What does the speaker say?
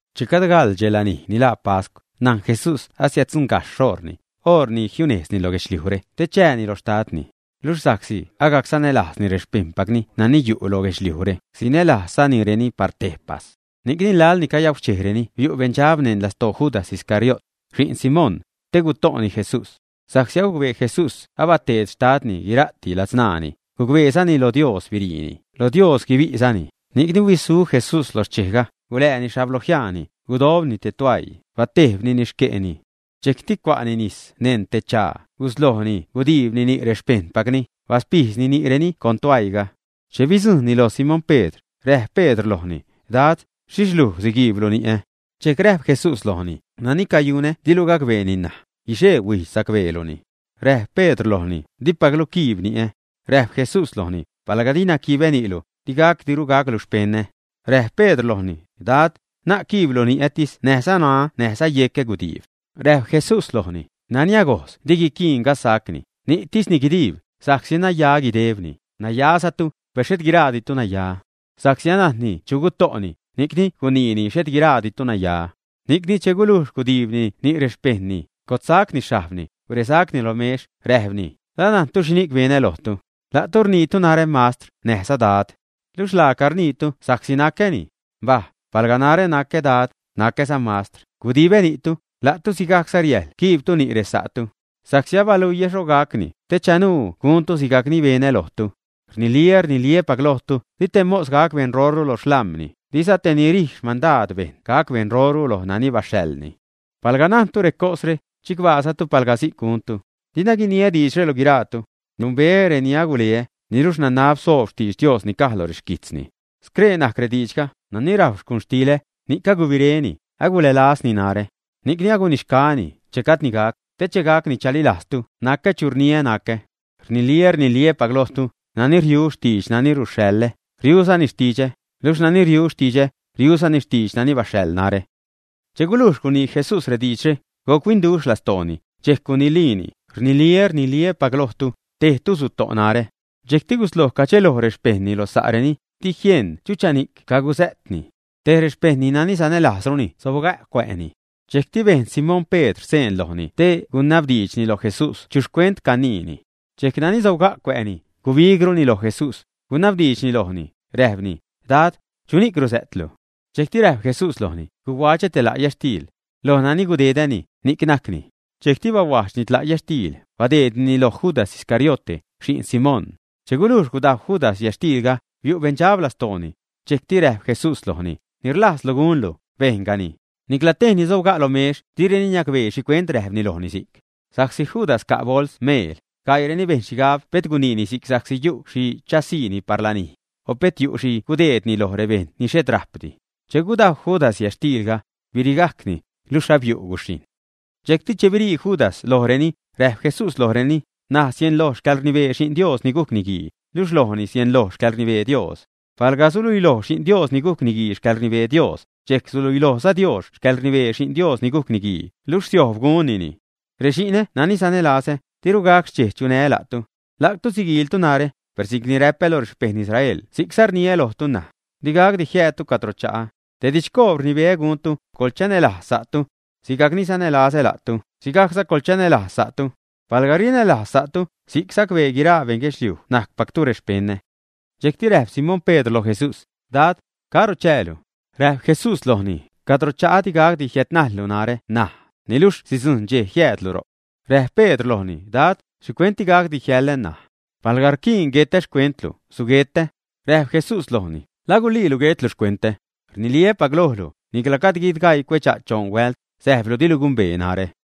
Che gajd gaḻ dxe lanij ni laa pascw, najn Jesús asiäddzuṉgajxh xoṟni, oṟ ni jiunejzni lo guedxliujre te chääni lo Xtadni. Luxh sa'csi agajc sanälajzni rexpejṉpacni nani yu' lo guedxliujre, sinälajzzanireni par tejpas. Ni'cni laḻ ni cayauxchejreni biu' beṉdxab neṉ lastoo Judas Iscariote, xi'n Simón, te guto'ni Jesús. Sa'csi agucbee Jesús abateed Xtadni guira'ti ladzṉaani, gucbeezani loj Dios biriini, lo Dios guibi'zani, ni'c huisu Jesús lo xchejga, gulääni xhablojiaani, gudojbni te tuäii, batejbnini xque'ni. Dxejcti cua'ni nis neṉ te chaa, guslojni gudiibni ni' rexpejṉpacni, baspijdzni ni'reni con tuäiiga. Che bidzujṉni loj Simón Pedr, räjp Pedr lojni: ―Dad, ¿xhixh luj siguiiblu ni'ä? Dxejc räjp Jesús lojni: ―Nani cayunä dilu gacbeeni ṉaj, guixee-huijdx sacbeeluni. Räjp Pedr lojni: ―¡Dipaclu quiib ni'ä! Räjp Jesús lojni: ―Palga dina quibä ni'lu, digacdiru gaclu xpeṉä. Räjp Pedr lojni: ―Dad, na'c quiiblu ni'ätis näjza ṉaä näjza yecä gudiib. Räjp Jesús lojni: ―Nani agojz di guiquiin gazsacni; ni'tisni guidiib, sa'csi naya guidebni; nayazatu, per xhet guiraaditu naya. Sa'csi anajnni chu guto'ni, ni'cni guniini: “Xhet guiraaditu naya.” Ni'cni che gulujx gudiibni ni' rexpejṉni, gotsacni xhajbni, guresacni lo mex, räjpni: ―¿La najntu xhini'c benä lojtu, ä? La'tu rniitu narä, Mastr näjza Dad. Luxh laaca rniitu sa'csi nacäni. Mbaj, palga narä ni nacä Dad, nacäza Mastr, gudibä ni'tu, la'tu sigajcza riäjl quiibtu ni' resa'tu. Sa'csi abaluiä lojtu xho gacni, te chanuu guntu sigajc ni benä lojtu. Rniliä, rniliä́pac lojtu, di te mos gac beṉroru lo xlam̲ni; diza te ni rij xmandaad bejṉ gac beṉroru loj nani baxhaḻni. Palga najntu recosre, chicbaazatu palga si'c guntu. ’Dina guiniä diidxre lo guiraatu. Numbeä reni aguleä, niluxh nanab soob xtidx Dios ni caj lo rexquijtzni. Scree najc rediidxga: “Nani rajw xcuxtilä, ni'c agubiréni, agulälazni narä.” Ni'cni agunixgaäni, che gajdni gac, te che gacni chalilajztu nacä chu rniä nacä. Rniliä, rniliä́pac lojtu, nani riu xtidx nani ruxhaḻä, riuzani xtidxä; luxh nani riu xtidxä, riuzani xtidx nani baxhaḻ narä. Che gulujx gunii Jesús rediidxre, guc-huinduxh lastooni, dxejc guniliini: ―Rniliä, rniliä́pac lojtu, tejtu suto' narä. Dxejc gusloj cadxeloj rexpejṉni lo sa'reni, di jien chuchani'c cagusä'tni. Tej rexpejṉni nani sanälajzruni sobga' cuä'ni. Dxejcti bejn Simón Pedr seen lojni te guiniabdiidxni loj Jesús chu xcuent caniini. Dxejc nani sobga' cuä'ni, gubigruni loj Jesús, gunabdiidxni lojni, räjpni: ―Dad, ¿chuni'c rusä'tlu? Dxejcti räjp Jesús lojni: ―Guhuadxä te la' yätxtiil. Loj nani gudedäni, ni'c najcni. Dxejcti bahuajdxni tla' yätxtiil, badeednini loj Judas Iscariote, xi'n Simón. Che gulujx gudajw Judas yätxtiilga, biu' beṉdxab lastooni. Dxejcti räjp Jesús lojni: ―Ni rlajzlu gunlu, bejngani. Nicla tej reni sobga' lo mex direni niacbee xhicuent räjpni lojni si'c. Sa'csi Judas ca' bols meel, gaiireni bejn xhigab pet guniini si'c sa'csi yu' xhi chasiini par lanij, o pet yu' xhi gudeedni loj rebeṉ ni xhet rajpdi. Che gudajw Judas yätxtiilga, birigajcni, luxh abiu' guxhijṉ. Dxejcti che abirii Judas lojreni, räjp Jesús lojreni: ―N̲aj sieṉloj xcäḻrnibee Xi'n Dios ni gujc Niguii, luxh lojni sieṉloj xcäḻrnibee Dios. Palga suluiloj Xi'n Dios ni gujc Niguii xcäḻrnibee Dios, dxejc suluilojza Dios xcäḻrnibee Xi'n Dios ni gujc Niguii, luxh siojb gunnini. Rexi'nä nani sanälazä, diru gac xchej chunää́ la'tu. La'tu siguiiltu narä, per si'cni räpä lo rexpejṉ Israel si'cza rniä lojtu ṉaj: Di gacdi jiäädtu cadro cha'a. Te didxcoob rnibeä guntu: Coḻchanälajz sa'tu. Sigajc ni sanälazä la'tu, sigajcza coḻchanälajz sa'tu. Palga rinälajz sa'tu, si'c sacbee guiraa beṉguedxliuj najcpactu rexpeṉä. Dxejcti räjp Simón Pedr loj Jesús: ―Dad, ¿caro chäälu? Räjp Jesús lojni: ―Cadro cha'ä digacdi jiädnajllu narä ṉaj; niluxh sidzujṉ dxej jiäädlu ro'c. Räjp Pedr lojni: ―Dad, ¿xhicuent digacdi jiäḻä ṉaj? Palga rquiin guetä xcuentlu, suguetä. Räjp Jesús lojni: ―¿La guliilu guetlu xcuentä, ä? Rniliä́pac lojlu, nicla gajd guidgaii cuedxa' choṉ huält, säjblu dilu gumbee najrä.